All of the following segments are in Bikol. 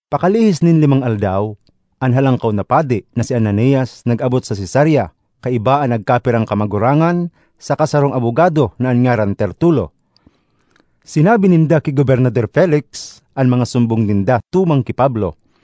Pakalihis nin limang aldaw, an Halangkaw na Padi na si Ananias nag-abot sa Cesarea kaiba an nagkapirang kamagurangan saka sarong abogado na an ngaran Tertulo. Sinabi ninda ki Gobernador Felix an mga sumbong ninda tumang ki Pablo.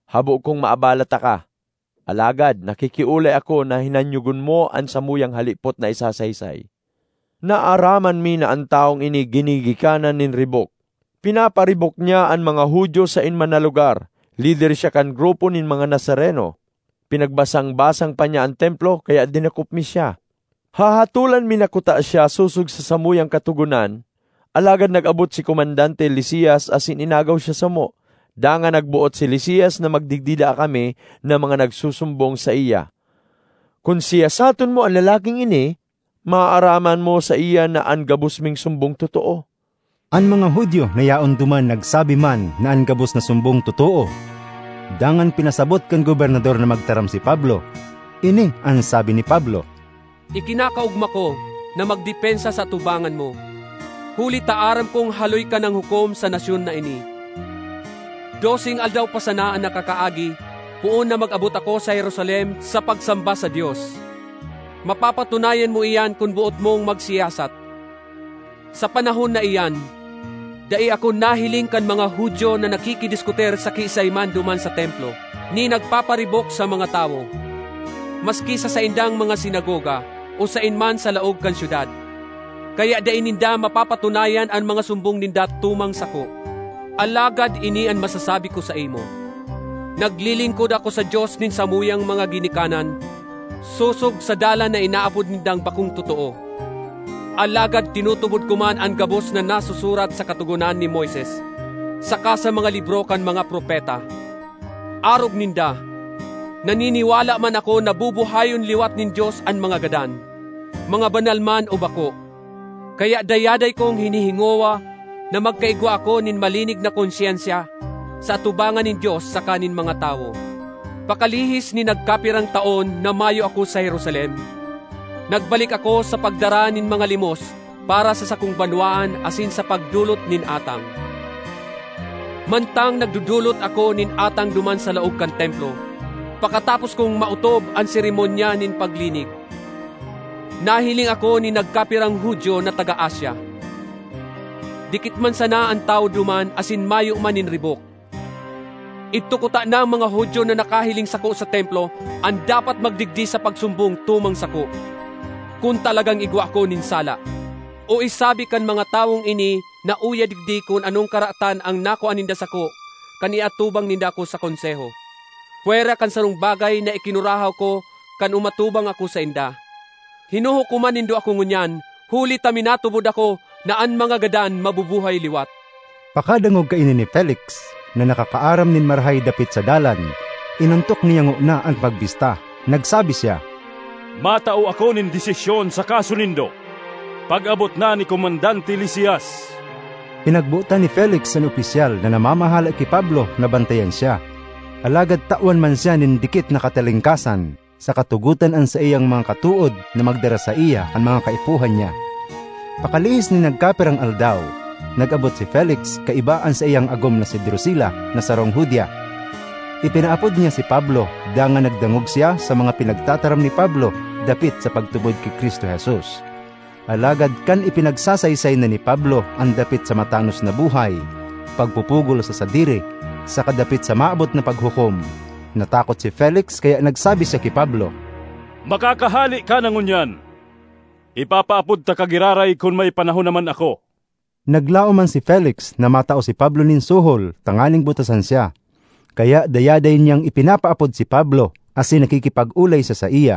Habo kong maabala taka, alagad nakikiolay ako na hinanyogon mo an samuyang halipot na isasaysay. Naaraman mi na an tawong ini ginigikanan nin ribok. Pinaparibok niya an mga Judio saen man na lugar. Lider siya kan grupo nin mga Nazareno. Pinagbasang-basang pa niya an Templo, kaya dinakop mi siya. [Hahatolan mi na kuta siya sosog sa samuyang Katogonan, alagad nag-abot si Komandante Lisias asin inagaw siya samo. Dangan nagboot si Lisias na magdigdi daa kami, na mga nagsusumbong saiya.] Kun siyasaton mo an lalaking ini, maaaraman mo saiya na an gabos ming sumbong totoo.” An mga Judio na yaon duman nagsabi man na an gabos na sumbong totoo. Dangan pinasabot kan gobernador na magtaram si Pablo. Ini an sabi ni Pablo: “Ikinakaogma ko na magdepensa sa atubangan mo, huli ta aram kong haloy ka nang hukom sa nasyon na ini. Doseng aldaw pa sana an nakakaagi poon na mag-abot ako sa Jerusalem sa pagsamba sa Dios—mapapatunayan mo iyan kun boot mong magsiyasat. Sa panahon na iyan, dai ako nahiling kan mga Judio na nakikidiskutir sa kiisay man duman sa Templo, ni nagpaparibok sa mga tawo, maski sa saindang mga sinagoga, o saen man sa laog kan syudad. Kaya dai ninda mapapatunayan an mga sumbong ninda tumang sako. Alagad ini an masasabi ko saimo: naglilingkod ako sa Dios nin samuyang mga ginikanan sosog sa Dalan na inaapod nindang bakong totoo; alagad tinutubod ko man an gabos na nasusurat sa Katogonan ni Moises saka sa mga libro kan mga propeta. Arog ninda, naniniwala man ako na bubuhayon liwat nin Dios an mga gadan, mga banal man o bako. Kaya dayaday kong hinihingowa na magkaigwa ako nin malinig na konsyensya sa atubangan nin Dios saka nin mga tawo. ”Pakalihis nin nagkapirang taon na mayo ako sa Jerusalem, nagbalik ako sa pagdara nin mga limos para sa sakong banwaan asin sa pagdolot nin atang. Mantang nagdodolot ako nin atang duman sa laog kan Templo, pakatapos kong maotob an seremonya nin paglinig, nahiling ako nin nagkapirang Judio na taga Asia. Dikit man sana an tawo duman asin mayo man nin ribok. Idto kutanang mga Judio na nakahiling sako sa Templo an dapat magdigdi sa pagsumbong tumang sako, kun talagang igwa ako nin sala. O isabi kan mga tawong ini na uya digdi kun anong karatan an nakua ninda sako kan iatubang ninda ako sa Konseho pwera kan sarong bagay na ikinurahaw ko kan umatubang ako sainda: ‘Hinuhukoman nindo ako ngunyan huli ta minatubod ako na an mga gadan mabubuhay liwat.’” Pakadangog kaini ni Felix, na nakakaaram nin marahay dapit sa Dalan, inontok niya ngona an pagbista. Nagsabi siya, “Matao ako nin desisyon sa kaso nindo pag-abot na ni Komandante Lisias.” Pinagbotan ni Felix an opisyal na namamahala ki Pablo na bantayan siya, alagad tawan man siya nin dikit na katalingkasan, saka tugotan an saiyang mga katood na magdara saiya kan mga kaipuhan niya. Pakalihis nin nagkapirang aldaw, nag-abot si Felix kaiba an saiyang agom na si Drusila na sarong Judia. Ipinaapod niya si Pablo dangan nagdangog siya sa mga pinagtataram ni Pablo dapit sa pagtubod ki Cristo Jesus. Alagad kan ipinagsasaysay na ni Pablo an dapit sa matanos na buhay, pagpupugol sa sadiri, saka dapit sa maabot na paghukom, natakot si Felix kaya nagsabi siya ki Pablo, “Makakahale ka na ngunyan. Ipapaapod taka giraray kun may panahon naman ako.” Naglaom man si Felix na matao si Pablo nin suhol tanganing butasan siya, kaya dayaday niyang ipinapaapod si Pablo asin nakikipag-olay siya saiya.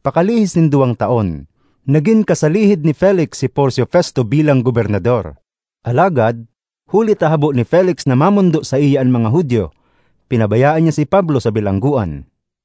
Pakalihis nin duwang taon, nagin kasalihid ni Felix si Porcio Festo bilang gobernador. Alagad huli ta habo ni Felix na mamondo saiya an mga Judio, pinabayaan niya si Pablo sa bilanggoan.